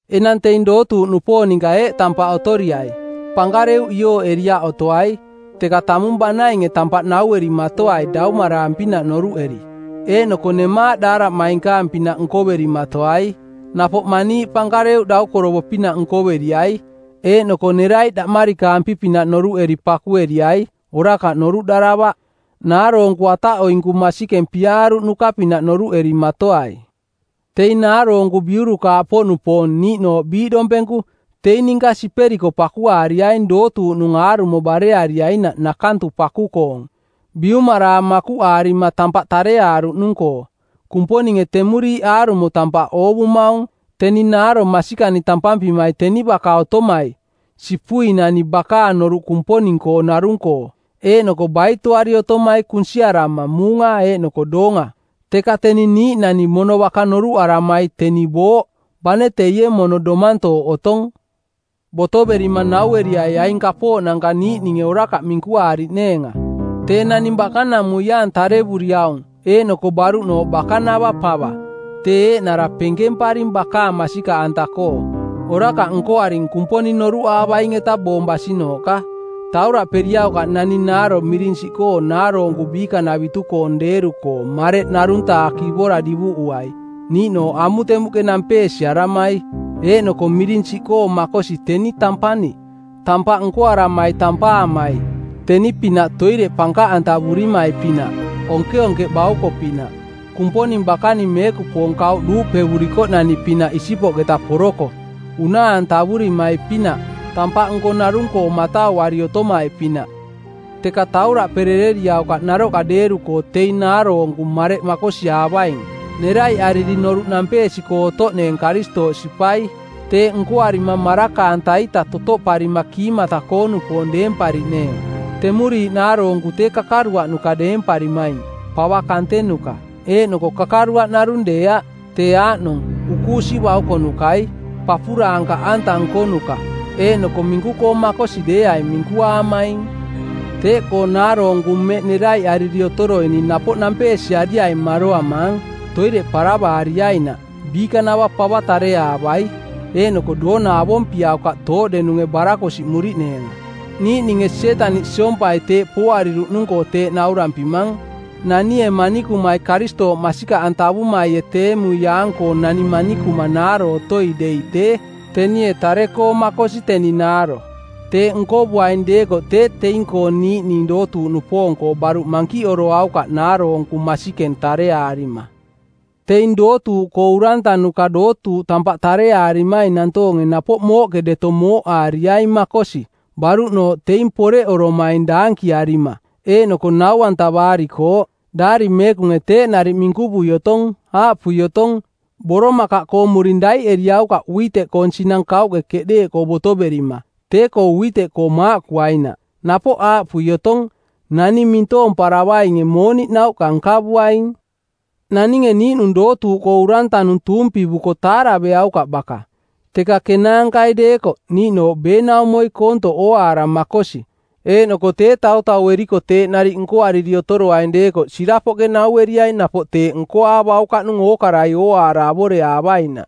Enang teing dootuuꞌnupoong ninka eeꞌ tampaꞌ otoriai: Pankareuꞌ iooꞌeriaꞌ otoai, teka tamung banainge tampaꞌ nauerimatoai daumaraang-pinaꞌ noruꞌeri. Eeꞌnoko nemaaꞌ daaraꞌmainkaang-pinaꞌ nkoverimatoai. Napoꞌ maniiꞌ pankareuꞌ daukorovo-pinaꞌ nkoveriai, eeꞌnoko neraiꞌ daꞌmarikaampi-pinaꞌ noruꞌeri pakueriai, orakaꞌ noruꞌdaravaꞌ. Naaroonku ataꞌoinku masikeng piaaruꞌnuka-pinaꞌ noruꞌerimatoai. Teing naaroonku biurukaaꞌpoꞌnupoong, niiꞌnooꞌ biiꞌdompenku, teing ninka siperiko pakuaariaing dootuuꞌnung aarumo bareariainaꞌ nakantu paku-koong, biumaraang makuꞌaarima tampaꞌ tareaaruꞌnung-koo. Kumponinge temuriiꞌ aarumo tampaꞌ oovumaung. Teni naaro masikani tampampimai teni baka otomai, sipuinani bakaang noruꞌ Kumponing-koo narung-koo eeꞌnoko baitoari otomai kunsiarama muunga eeꞌnoko doonga. Teka teni niiꞌnani mono baka noruꞌaramai teni booꞌ, bane teie mono domantooꞌ otong. Botoverima naueriai aing kapooꞌnanka niiꞌninge orakaꞌ minkuaariꞌneenga. Tee naning bakanamuiaang tarevuriaung eeꞌnoko baruꞌnooꞌ bakanava pava, tee eeꞌnara penkemparing bakaang masikaꞌanta-koo, orakaꞌ nkoaring Kumponing noruꞌaavaing-eta boong basinooꞌka. Tauraꞌperiaukaꞌ naning naaro miring siꞌkoo naaroonku biikanavitu-koong deeru-koo mareꞌ ˜narung-taa kivora divuꞌuai, niiꞌnooꞌ amutemuꞌke nampeesiaramai. Eeꞌnoko miring siꞌkoo makosi teni tampani, tampaꞌ nkoaramai tampaamai, teni-pinaꞌ toireꞌ pankaꞌantavurimai-pinaꞌ, onkeonkeꞌ bauko-pinaꞌ, Kumponing bakaning meekupoong kauꞌ duuꞌpevurikoꞌnani-pinaꞌ isipoꞌketa poroko, unaa-antavurimai-pinaꞌ, tampaꞌnko narung-koo matauari otomai-pinaꞌ. Teka tauraꞌperereriaukaꞌ naroꞌka deeru-koo teing naaroonku mareꞌ makosiaavaing, neraiꞌariri noruꞌ nampeesi-koo otoꞌneeng Karistooꞌ sipai. Teeꞌ nkoarima maraka-anta-ita totoꞌparima kiimata-koo-nupoong deempariꞌneeng. Temuriiꞌ naaroonku tee kakaruaꞌnuka deemparimaing, pava kantenuka; eeꞌnoko kakaruaꞌ narung deeaꞌ, tee aaꞌnong: ukuusi baukonukai, papuraankaꞌanta nkonuka, eeꞌnoko minku-koo makosi deeaing minkuaamaing. Teeꞌkoo naaroonku mmeꞌ neraiꞌariri otoroining napoꞌ nampeesiariaing maroamaang, toireꞌ paravaariainaꞌ, biikanava pava tareaavai, eeꞌnoko doona avompiaukaꞌ tooꞌdenunge barakosiꞌmuriꞌneenga. Niiꞌninge Sietaniꞌ siompai teeꞌ pooariruꞌnung-koo teeꞌ naurampimang. Nanie manikumai Karistooꞌ masikaꞌantavumaie teemuiaang-koo nani manikuma naaro otoi dei tee, tenie tare-koo makosi teni naaro. Teeꞌ nkovuaing deekoꞌ tee teing-koo niiꞌning dootuuꞌnupoong-koo baruꞌ mankiꞌoroaukaꞌ naaroonku masikeng tareaarima. Teing dootuuꞌkoo urantanuka dootuuꞌ tampaꞌ tareaarimaing nantoonge napoꞌ mooꞌke deto mooꞌaariaing makosi, baruꞌnooꞌ teing poreꞌoromaing daankiaarima eeꞌnoko nau-antavaarikooꞌ. Daari Meekunge teeꞌ nariꞌ minkuvui otong, aaꞌpui otong, “Boromakaꞌkoong muring daiꞌeriaukaꞌ uiteꞌkoong˜ sinang kauꞌke keꞌdeeꞌkoo botoverima, tee-koo uiteꞌkoo maaꞌkuainaꞌ.” Napoꞌ aaꞌpui otong, “Naning mintoomparavainge mooniꞌ nauꞌka nkavuaing.” Naninge niiꞌnung dootuuꞌkoo urantanung tuumpivuko taaraveaukaꞌ baka, teka kenaankai deekoꞌ, niiꞌnooꞌ beenaumoi koontoꞌ ooaara makosi. Eeꞌnoko tee tautaueriko teeꞌ nariꞌ nkoariri otoroaing deekoꞌ sirapoꞌke naueriaing napoꞌ teeꞌ nkoaavaukaꞌnung ookarai ooaara avoreaavainaꞌ.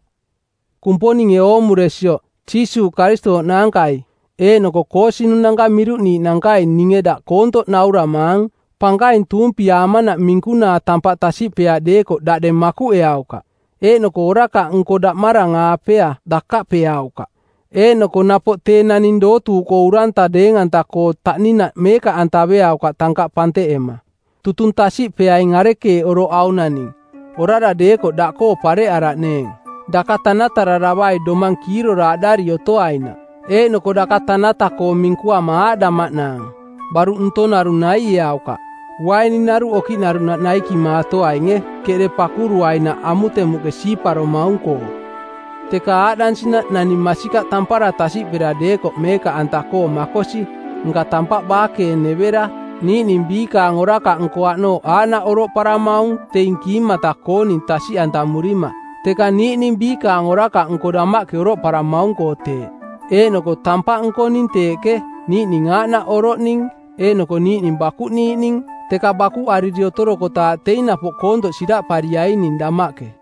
Kumponinge oomuresioꞌ, Jiisuuꞌ Karistooꞌ naankai eeꞌnoko koosinunanka miruꞌniiꞌnankai ninge daꞌ koontoꞌ nauramaang: Pankaing tuumpiaamanaꞌ minkunaa tampaꞌ tasiꞌpeaꞌ deekoꞌ daꞌdeng makuꞌeaukaꞌ, eeꞌnoko orakaꞌnko daꞌmarang-aapea dakaꞌpeaukaꞌ. Eeꞌnoko napoꞌ tee naning dootuuꞌkoo uranta deeng-anta-koo taꞌninaꞌ meekaꞌantaveaukaꞌ tankaꞌ panteꞌema. Tutung tasiꞌpeaing arekeeꞌ oroꞌ aung naning, orara deekoꞌ daꞌkoo pareꞌaraꞌneeng. Daka tanatararavai domang kiiroraaꞌdari otoainaꞌ. (Eeꞌnoko daka tanata-koo minkuama aaꞌdamaꞌnaang: Baruꞌ ntong narung naieaukaꞌ, uaininaruꞌ okiꞌnaruꞌnaꞌ naikimaatoainge, keꞌde pakuruainaꞌ amutemuꞌke siiparomaung-koo.) Teka aaꞌdansinaꞌ naning masikaꞌ tampara tasiꞌpera deekoꞌ meekaꞌanta-koo makosi, nka tampaꞌ baakeenevera. Niiꞌning biikaang orakaꞌnko aꞌnooꞌ aaꞌnaꞌ oroꞌparamaung teing kiimata-kooning tasiꞌantamurima, teka niiꞌning biikaang orakaꞌnko damaꞌke oroꞌparamaung-koo teeꞌ. Eeꞌnoko tampaꞌ nkoning teeꞌke, niiꞌning aaꞌnaꞌ oroꞌning eeꞌnoko niiꞌning bakuꞌniiꞌning, teka bakuꞌariri otorokotaaꞌ teing napoꞌ koontoꞌ siraꞌpariaing damaꞌke.